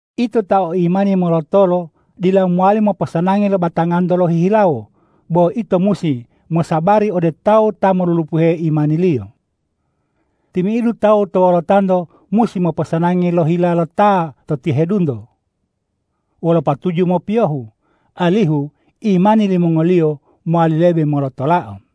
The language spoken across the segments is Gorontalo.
Ito ta o imani molotolo dila mowali moposanangi lo batanganto lohihilawo, bo ito musi mosabari ode tawu ta molulupuhe imaniliyo. Timi'idu tawu to wolotanto musi moposanangi lo hila lo ta to tihedunto wolo patuju mopiyohu, alihu imani limongoliyo mowali lebe molotolao.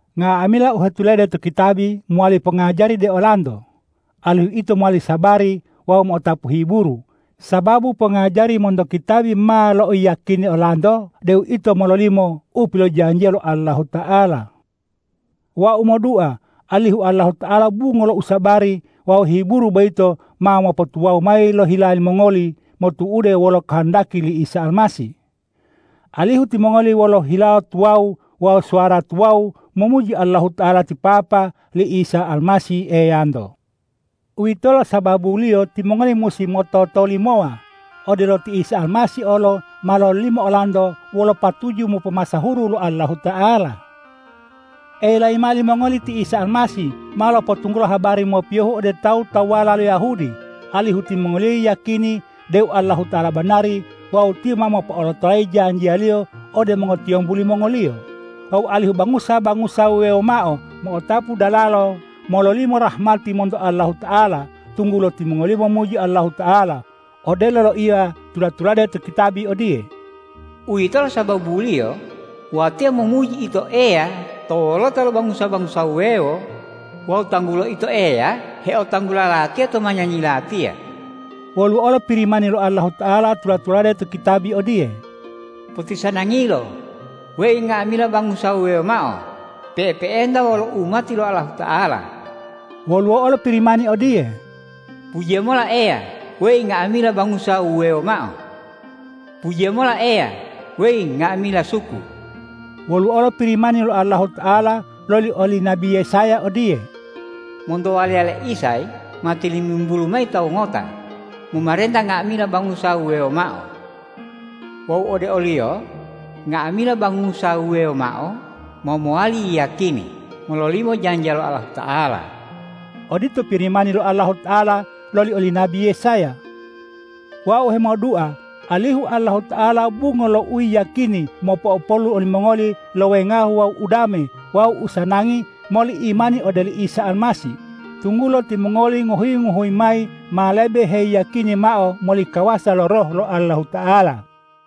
Nga'amila u hetulade to kitabi mowali pongajari ode olanto, alihu ito mowali sabari wawu mo'otapu hiburu, sababu pongajari monto kitabi ma lo'oyiyakini olanto deu ito ma mololimo u pilojanjiya lo Allahuta'ala. Wau modua alihu Allahuta'ala bungo lo usabari wawu hiburu boyito ma mopotuwawu mayi lo hila limongoli, motu'ude wolo kohondaki li Isa Almasih, alihu timongoli wolo hilawo tuwawu wawu suwara tuwawu momuji Allahuta'ala ti Papa li Isa Almasih Eyanto. Uwitolo sababuliyo timongoli musi mototolimowa, odelo ti Isa Almasih olo ma lololimo olanto wolo patuju mopomasahuru lo Allahuta'ala. Elayi mao limongoli ti Isa Almasih ma lopotunggulo habari mopiyohu ode tawu-tawuwala lo Yahudi, alihu timongoliyo yiyakini deu Allahuta'ala banari wawu Tiyo ma mopo'olotolayi janjiya-Liyo ode mongotiyombu limongoliyo, wawu alihu bangusa-bangusa wuwewo mao mo'otapu dalalo mololimo rahmati monto Allahuta'ala, tunggulo timongoliyo momuji Allahuta'ala. Odelo loiya tula-tulade to kitabi odiye,”Uwitolo sababuliyo watiya momuji Ito Eya to wolota lo bangusa-bangusa wuwewo wawu tanggulo Ito Eya heotanggula latiya to manyanyi latiya.” Woluwo olo Pirimani lo Allahuta'ala tula-tulade to kitabi odiye,”Potisanangilo, weyi nga'amila bangusa wuwewo mao pe'epe'enta wolo umati lo Allahuta'ala.” Woluwo olo Pirimani odiye,”Pujiya mola Eya, weyi nga'amila bangusa wuwewo mao! Pujiya mola Eya, weyi nga'amila suku!” Woluwo olo Pirimani lo Allahuta'ala loli oli nabi Yesaya odiye,”Monto waliya le Isay ma tilimimbulu mayi tawu ngota, momarenta nga'amila bangusa wuwewo mao. Wawu ode o-Liyo nga'amila bangusa wuwewo mao ma mowali yiyakini mololimo janjiya lo Allahuta'ala.” Odito Pirimani lo Allahuta'ala loli oli nabi Yesaya. Wau hemodua alihu Allahuta'ala bungo lo uyiyakini mopo'opolu olimongoli lo wengahu wawu udame wawu usanangi moli imani ode oli Isa Almasih, tunggulo timongoli ngohuyi-ngohuyi mayi ma lebe heyiyakini mao moli kawasa lo Roh lo Allahuta'ala.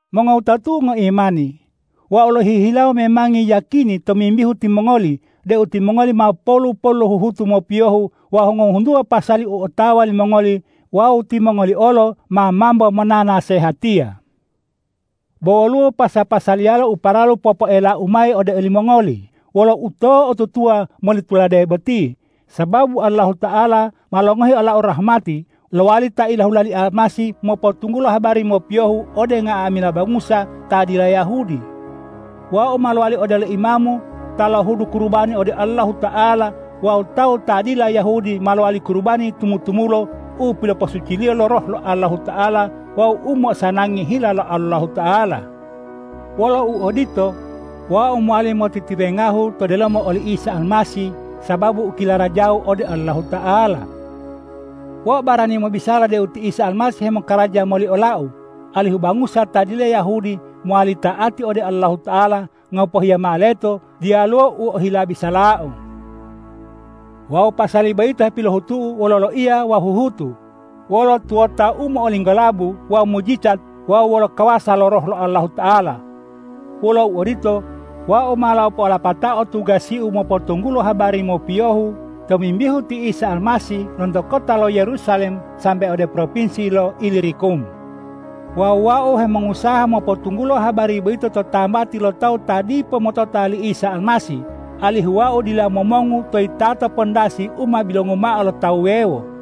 Mongowutatu'u ngoimani, wau lohihilawo memangi yiyakini tomimbihu timongoli deu timongoli ma polu-polu lo huhutu mopiyohu wawu ngohuntuwa pasali u otawa limongoli wawu timongoli olo ma mambo monanasehatiya. Bo woluwo pasa-pasaliyala u paralu popoelau mayi ode olimongoli wolo uto'otutuwa moli tulade boti. Sababu Allahuta'ala ma longohi olau rahmati lowali ta ilahula li Isa Almasih mopotunggulo habari mopiyohu ode nga'amila bangusa ta dila Yahudi. Wau ma lowali odelo imamu ta lohudu kurubani ode Allahuta'ala wawu tawu ta dila Yahudi ma lowali kurubani tumu-tumulo u piloposuciliyo lo Roh lo Allahuta'ala wawu u mo'osanangi hila Allahuta'ala. Wolo uodito, wau mowali motitiwengahu to delomo oli Isa Almasih sababu u kilarajau ode Allahuta'ala. Wau barani mobisala deu ti Isa Almasih hemokaraja moli olau, alihu bangusa ta dila Yahudi mowali ta'ati ode Allahuta'ala ngopohiya mao leto diyaluwo u ohila bisalau. Wawu pasali boyito hepilohutu'u wolo loiya wawu huhutu, wolo tuwota u mo'olinggolabu wawu mujijat wawu wolo kawasa lo Roh lo Allahuta'ala. Wolo uodito, wau ma lopo'olapatao tugasiu mopotunggulo habari mopiyohu tomimbihu ti Isa Almasih lonto kota lo Yerusalem sambe ode propinsi lo Ilirikum. Wawu wau hemongusaha mopotunggulo habari boyito to tambati lo tawu ta dipo motota li Isa Almasih, alihu wau dila momongu to yitato pandasi u ma bilongu mao lo ta wuwewo.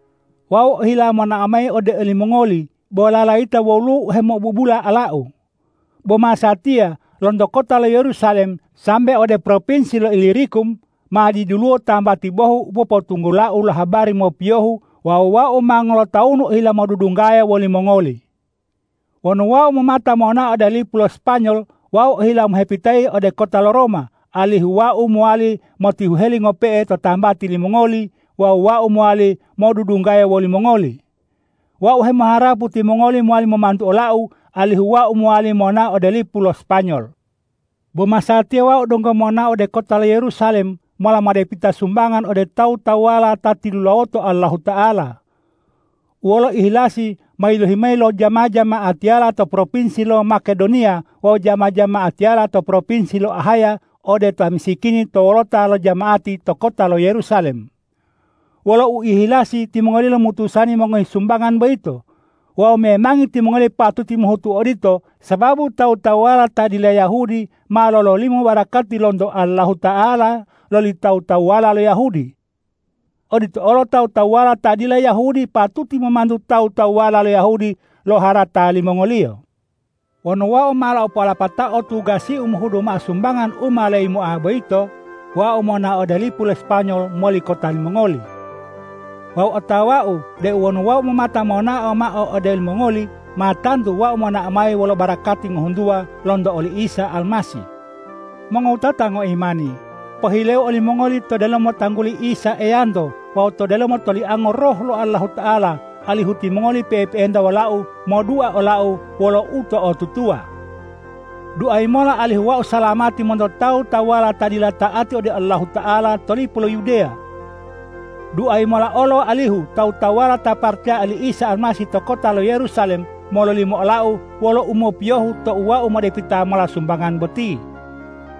Wau ohila monao mayi ode olimongoli bo lalayita woluwo u hemo'obubula olau. Bo masatiya lonto kota lo Yerusalem sambe ode propinsi lo Ilirikum ma diduluwo tambati bohu u popotunggulau lo habari mopiyohu wawu wau ma ngolotawunu ohila modudunggaya wolimongoli. Wonu wau momata monao ode lipu lo Spanyol, wau ohila mohepitayi ode kota lo Roma, alihu wau mowali motihuheli ngope'e to tambati limongoli wawu wau mowali modudunggaya wolimongoli. Wau hemoharapu timongoli mowali momantu olau, alihu wau mowali monao ode lipu lo Spanyol. Bo masatiya wau donggo monao ode kota lo Yerusalem mola modepita sumbangan ode tawu-tawuwala ta tilulawoto Allahuta'ala, u wolo uihilasi ma yilohi mayi lo jama-jama'atiyala to propinsi lo Makedoniya wawu jama-jama'atiyala to propinsi lo Ahaya ode ta misikini to wolota lo jama'ati to kota lo Yerusalem. Wolo uihilasi timongoliyo lomutusani mongohi sumbangan boyito. Wawu memangi timongoliyo patuti mohutu odito, sababu tawu-tawuwala ta dila Yahudi ma lololimo barakati lonto Allahuta'ala loli tawu-tawuwala lo Yahudi. Odito olo tawu-tawuwala ta dila Yahudi patuti momantu tawu-tawuwala lo Yahudi lo harata limongoliyo. Wonu wau ma lopo'olapatao tugasiu mohudu mao sumbangan u ma leyimoa boyito, wau ma monao ode lipu lo Spanyol moli kota limongoli. Wawu otawau deu wonu wau momata monao mayi ode olimongoli, ma tantu wau monao mayi wolo barakati ngohuntuwa lonto oli Isa Almasih. Mongowutata ngoimani, pohileu olimongoli to delomo tangguli Isa Eyanto wawu to delomo toliango Roh lo Allahuta'ala, alihu timongoli pe'epe'enta wolau modua olau wolo uto'otutuwa. Duayi mola alihu wau salamati monto tawu-tawuwala ta dila ta'ati ode Allahuta'ala to lipu lo Yudeya. Duayi mola olo alihu tawu-tawuwala ta paracaya li Isa Almasih to kota lo Yerusalem mololimo olau wolo umopiyohu tou wau modepita mola sumbangan boti.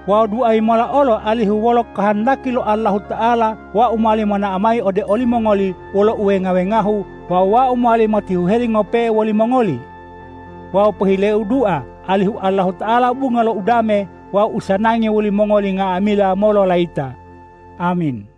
Wawu duayi mola olo alihu wolo kohondaki lo Allahuta'ala wau mowali monao mayi ode olimongoli wolo uwenga-wengahu wawu wau mowali motihuheli ngope'e wolimongoli. Wawu pohileyau dua alihu Allahuta'ala bungo lo udame wawu usanangi wolimongoli nga'amila mololayita! Amin.